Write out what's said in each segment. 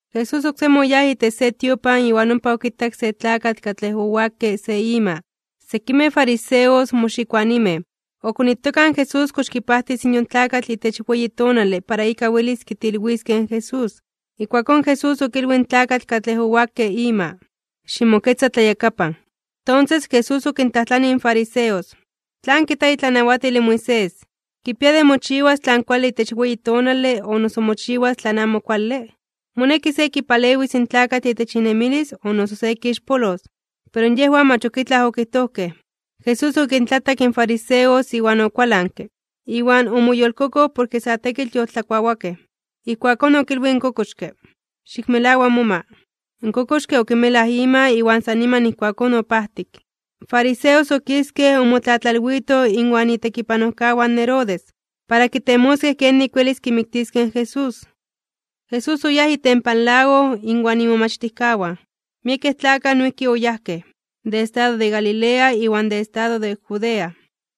Jesús oksemi oyáj itech se tiopan iwan ompa okitak se tlakatl katlej owakke se ima. Sekimej fariseos moxikoanimej, okonitokaj in Jesús kox kipajtis yon tlakatl itech weyi tonale para ika welis kitilwiskej in Jesús. Ijkuakón Jesús okilwij in tlakatl katlej owakke ima: ―Ximoketza tlayakapan. Tonses, Jesús okintlajtlanij in fariseos: ―¿Tlan kijta itlanawatil in Moisés, kipia de mochiwas tlan kuale itech weyi tonale, o noso mochiwas tlan mach kuale? ¿Moneki se kipalewis in tlakatl itech inemilis o noso se kixpolos? Pero yejwan mach ok itlaj okijtojkej. Jesús okintlatak in fariseos iwan okualanke, iwan omoyolkokoj porke sa tekitl yoltlakuawakej. Ijkuakón okilwij in kokoxke: ―Xikmelawa moma. In kokoxke okimelaj ima iwan san niman ijkuakón opajtik. In fariseos okiskej omotlatlalwitoj inwan itekipanojkawan Herodes, para kitemoskej kenik welis kimiktiskej in Jesús. Jesús oyáj itempan lago inwan imomachtijkawan, miekej tlakaj noijki oyajkej, de estado de Galilea iwan de estado de Judea.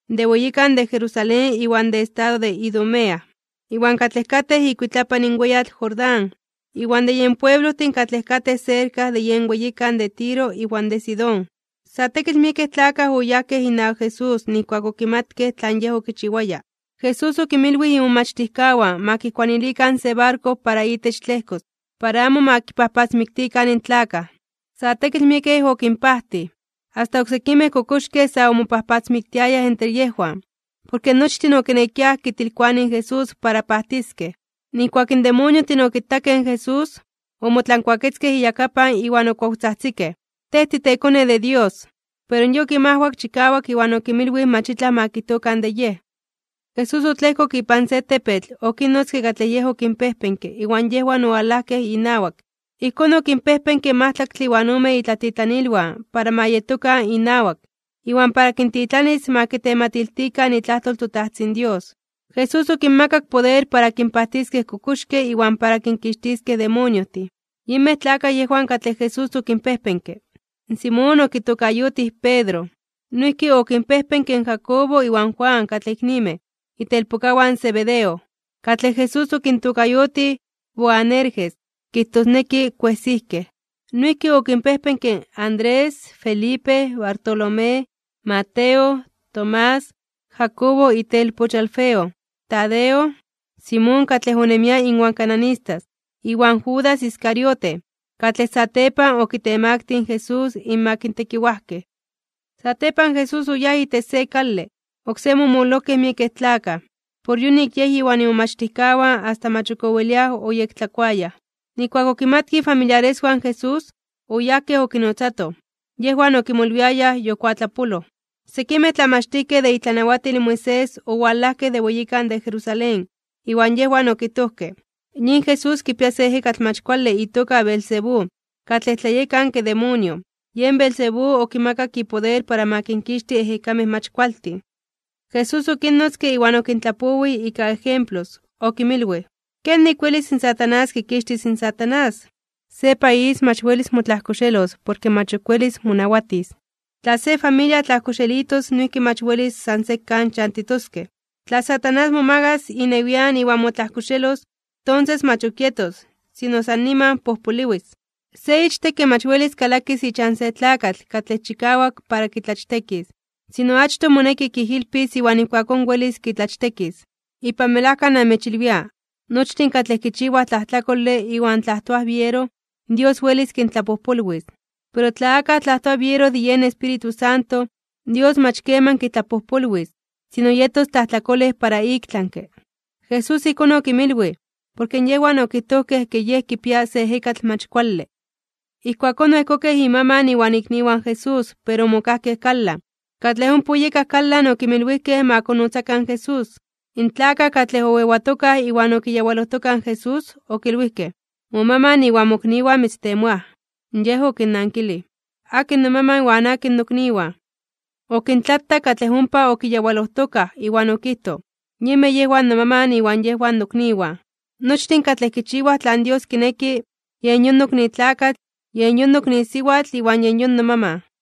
De weyikan de Jerusalén iwan de estado de Idumea, iwan katlej katej ikuitlapan in weyatl Jordán, iwan de yen pueblojtin katlej katej serka de yen weyikan de Tiro iwan de Sidón. Sa tekitl miekej tlakaj oyajkej inawak Jesús nijkuak okimatkej tlan Yej okichiwaya. Jesús okinmilwij imomachtijkawan ma kijkuanilikan se barko para itech tlejkos, para amo ma kipajpatzmiktikan in tlakaj. Sa tekitl miekej okinpajtij, asta oksekimej kokoxkej sa omopatzmiktiayaj entre yejwan, porke nochtin okinekiaj kitilkoanij in Jesús para pajtiskej. Nijkuak in demoniojtin okitakej in Jesús, omotlankuaketzkej iyakapan iwan okuawtzajtzikej: ―¡Tej titeKone de Dios! Pero Yej okinmajwak chikawak iwan okinmilwij mach itlaj ma kijtokan de Yej. Jesús otlejkok ipan se tepetl, okinnotzke katlej Yej okinpejpenke iwan yejwan owalajkej inawak. Ijkón okinpejpenke in majtlaktle iwan ome itlatitlanilwan para ma yetokan inawak, iwan para kintitlanis ma kitematiltikan itlajtol in toTajtzin Dios. Jesús okinmakak poder para kinpajtiskej kokoxkej iwan para kinkixtiskej demoniojtin. Yinmej tlakaj yejwan katlej Jesús okinpejpenke: In Simón okitokayotij Pedro, noijki okinpejpenke in Jacobo iwan Juan katlej iknimej, itelpokawan Zebedeo, katlej Jesús okintokayotij Boanerges, kijtosneki kuejsijkej. Noijki okinpejpenke: Andrés, Felipe, Bartolomé, Mateo, Tomás, Jacobo itelpoch in Alfeo, Tadeo, Simón katlej onemia inwan cananistas, iwan Judas Iscariote, katlej satepan okitemaktij (okitemaktilij) in Jesús inmak tekiwajkej. Satepan Jesús oyáj itech se kale. Oksemi omololojkej miekej tlakaj, por yonik Yej iwan imomachtijkawan asta mach ok oweliaj oyektlakuayaj. Nijkuak okimatkej ifamiliareswan in Jesús, oyajkej okinotzatoj, yejwan okimolwiayaj yokuatlapoloj. Sekimej tlamachtijkej de itlanawatil in Moisés owalajkej de weyikan de Jerusalén. Iwan yejwan okijtojkej: ―Yin Jesús kipia se ejekatl mach kuale itoka Beelzebú, katlej tlayekanke demonio, yen Beelzebú okimakak ipoder para ma kinkixti ejekamej mach kualtin. Jesús okinnotzke iwan okintlapowij ika ejemplos. Okinmilwij: ―¿Kenik welis in Satanás kikixtis in Satanás? Se país mach welis motlajkoxelos porke mach ok welis monawatis. Tla se familia tlajkoxelitos noijki mach welis san sekan chantitoskej. Tla Satanás momagas inewian iwan motlajkoxelos, tonses mach ok yetos, sino san niman pojpoliwis. ’Se ichtekke mach welis kalakis ichan se tlakatl katlej chikawak para kitlachtekis. Sino achtoj moneki kijilpis iwan ijkuakón welis kitlachtekis. ’Ipan melajka namechilwia, nochtin katlej kichiwaj tlajtlakole iwan tlajtoaj biero, Dios welis kintlapojpolwis. Pero tla akaj tlajtoa biero de yen Espíritu Santo, Dios mach keman kitlapojpolwis, sino yetos tlajtlakolej para iktlanke (ik tlami). Jesús ijkón okinmilwij, porke yejwan okijtojkej ke Yej kipia se ejekatl mach kuale. Ijkuakón oejkokej imaman iwan ikniwan in Jesús pero omokajkej kalan. Katlej ompa oyekaj kalan okinmilwijkej ma konnotzakan in Jesús. In tlakaj katlej oewatokaj iwan okiyawalojtokaj in Jesús, okilwijkej: ―Momaman iwan mokniwan mitztemoaj. Yej okinnankilij: ―¿Akin nomaman iwan akin nokniwan? Okintlatak katlej ompa okiyawalojtokaj iwan okijtoj: ―Yinmej yejwan nomaman iwan yejwan nokniwan. Nochtin katlej kichiwaj tlan Dios kineki, yen yon nokni tlakatl, yen yon nokni siwatl iwan yen yon nomaman.